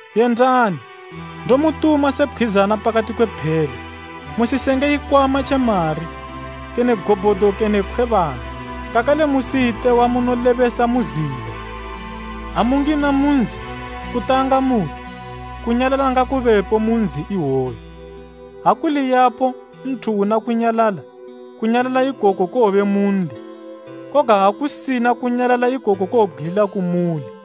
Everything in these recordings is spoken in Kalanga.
Yendani, ndomutuma se pkhwizana pakati kwe phele. Musisenge ikwama tje mari, kene gobhodo kene khwebana, kakale musiyite wamunolebesa mu zila. Ha mungina mu nzi, kutanga muti, ‘Kunyalala ngakubepo mu nzi iwoyo.’ Ha kuli yapo nthu una kunyalala, kunyalala ikoku kowobe munli, koga ha kusina, kunyalala ikoku kowobgwilila kumuli.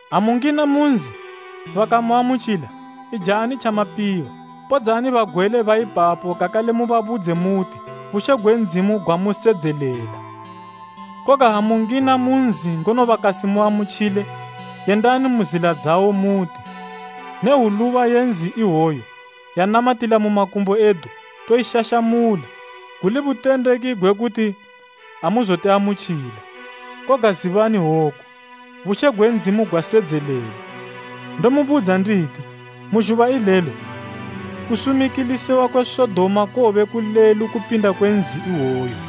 Ha mu ngina mu nzi, bakamuamutjila, ijani tjamapiwa. Podzani bagwele ba ipapo kakale mu babudze muti, ‘Bushe gwe Ndzimu gwamusedzelela.’ Koga ha mu ngina mu nzi ngono bakasimuamutjile, yendani mu zila dzawo muti, ‘Ne hwuluba ye nzi iwoyo yanamatila mu makumbo edu toishashamula, guli butendeki gwe kuti amuzotiamutjila. Koga zibani woku, bushe gwe Ndzimu gwasedzelela.’ Ndomubudza nditi, mu zhuba ilelo kusumikilisiwa kwe Sodoma kowobe kulelu kupinda kwe nzi iwoyo.”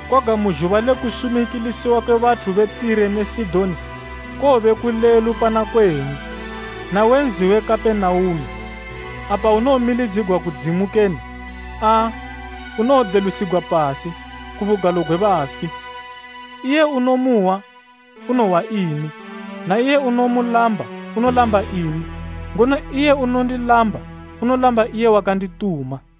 Koga mu zhuba le kusumikilisiwa kwe bathu be Tire ne Sidoni kowobe kulelu pana kwenyu. Nawe nzi we Kapenaume, apa unomilidzigwa kudzimu kene? Aa, unowodelusigwa pasi, ku bugalo gwe bafi. “Iye unomuhwa unohwa imi, na iye unomulamba unolamba imi, ngono iye unondilamba unolamba iye wakandituma.”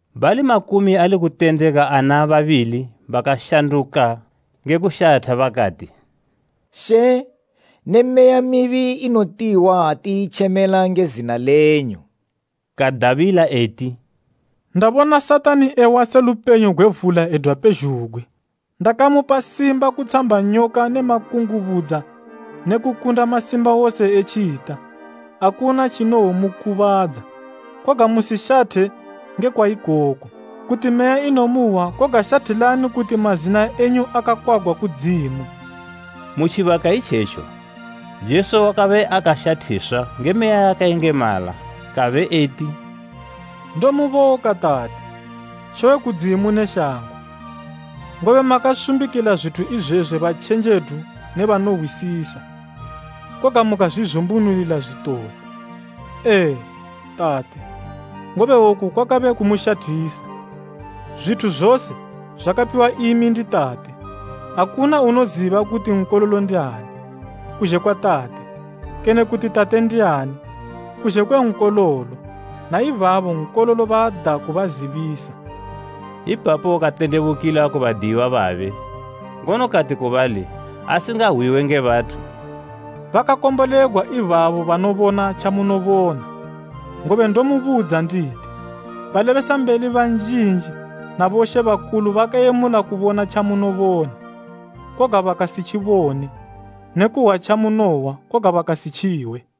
Bali makumi ali kutendeka ana babili bakashanduka nge kushatha, bakati, “She, ne meya mibi inotihwa ha tiyitjemela nge zina lenyu.” Kadabila eti, “Ndabona Satani ewa se lupenyo gwe vula edwa pezhugwi. Ndakamupa simba kutshamba nyoka ne makungubudza ne kukunda masimba wose e tjita, akuna tjinowomukubadza. Koga musishathe ngekwa ikoku, kuti meya inomuhwa koga shathilani kuti mazina enyu akakwagwa kudzimu.” Mu tjibaka itjetjo, Jesu wakabe akashathiswa nge Meya yakayengemala kabe eti, “Ndomuboka, Tate, She we kudzimu ne shango, ngobe makasumbikila zwithu izwezwi batjenjedu ne banohwisisa, koga mukazwizumbunulila zwitole. Ee, Tate, ngobe oku kwakabe kumushathisa. “Zwithu zose zwakapiwa imi ndi Tate. Akuna unoziba kuti Nkololo ndiani, kuzhe kwa Tate, kene kuti Tate ndiani kuzhe kwe Nkololo na ibabo Nkololo baada kubazibisa.” Ipapo katendebukila ku badiyiwa babe, ngono kati ku bali asingahwiwe nge bathu, “Bakakombolegwa ibabo banobona tjamunobona! Ngobe Ndomubudza nditi, balebesambeli banjinji na bomambo bakayemula kubona tjamunobona, koga bakasitjibone ne kuhwa tjamunohwa koga bakasitjihwe.”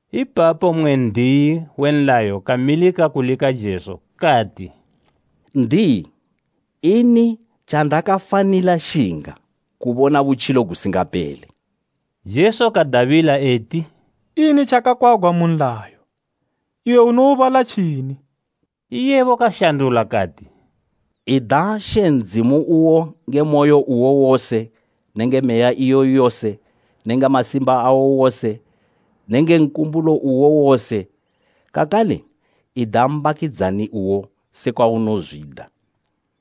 Ipapo mmwe n'diyi we nlayo kamilika kulika Jesu, kati, “N'diyi, ini tjandakafanila shinga kubona butjilo gusingapele?” Jesu kadabila eti, “Ini tjakakwagwa mu nlayo? Iwe unoubala tjini?” Iyebo kashandula kati, “Kwakakwagwa kuyi, ‘Ida She Ndzimu uwo nge moyo uwo wose nenge meya iyo yose nenge masimba awo wose nenge nkumbulo uwo wose’ kakale, ‘Ida mbakidzani uwo sekwa unozwida.’”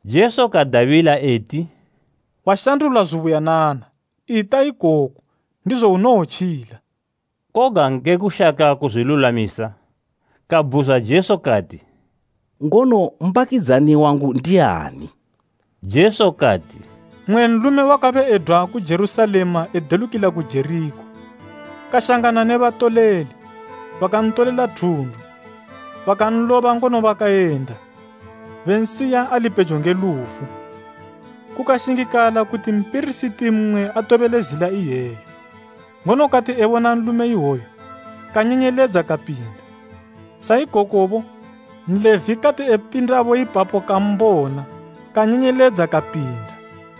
Jesu kadabila eti, “Washandula zubuyanana. Ita ikoku, ndizo unowotjila.” Koga nge kushaka kuzwilulwamisa, kabhuzwa Jesu kati, “Ngono mbakidzani wangu ndiani?” Jesu kati, “Mmwe nlume wakabe edwa ku Jerusalema edelukila ku Jerikho, kashangana ne batoleli, bakantolela thundu, bakanloba ngono bakayenda bansiya ali pejo nge lufu. Kukashingikala kuti mpirisiti mmwe atobele zila iyeyo, ngono kati ebona nlume iwoyu, kanyenyeledza kapinda. Sa ikokobo, Nlevi kati epinda bo ipapo kambona, kanyenyeledza kapinda.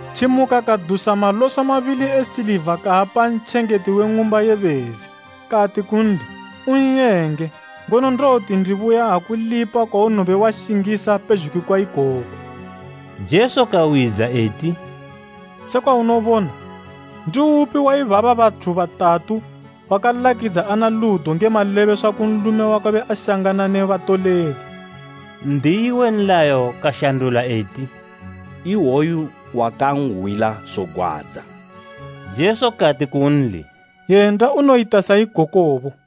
Tjimuka kadusa maloso mabili e siliva kaapa ntjengeti we ng'umba ye bezi. Kati kunli, ‘Un'yenge, ngono ndowoti ndibuya akulipa kwaunowobe washingisa pezhugwi kwa ikoku.’” Jesu kawidza eti, “Sekwa unobona, ndiupi waibaba bathu batatu, wakalakidza ana ludo nge malebeswa ku nlume wakabe ashangana ne batoleli?” N'diyi we nlayo kashandula eti, “Iwoyo wakanhwila zogwadza.” Jesu kati kunli, “Yenda unoyita sa ikokobo.”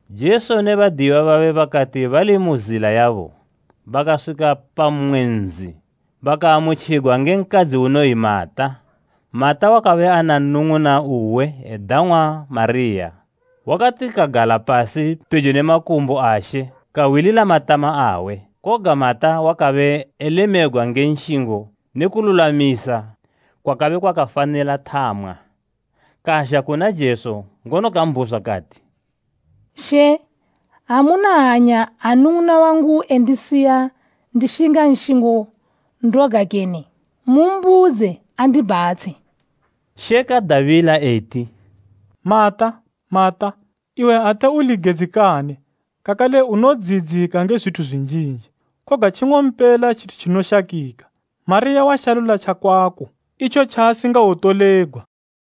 Jesu ne badiyiwa babe bakati bali mu zila yabo, bakaswika pamwe nzi bakaamutjigwa nge nkadzi unoyi Mata. Mata wakabe ana nnung'una uwe edang'wa Mariya, wakatikagala pasi pejo ne makumbo a She kahwilila matama awe. Koga Mata wakabe elemegwa nge nshingo ne kululwamisa kwakabe kwakafanila thamwa. Kazha kuna Jesu ngono kambhuzwa kati, “She, amuna hanya ha nnung'una wangu endisiya ndishinga nshingo ndoga kene? Mumbudze andibhatshe.” She kadabila eti, “Mata, Mata, iwe ate uli gedzikane kakale unodziyidzika nge zwithu zwinjinji, koga tjing'ompela tjithu tjinoshakika, Mariya washalula tjakwako, itjo tjaasingawotolegwa.”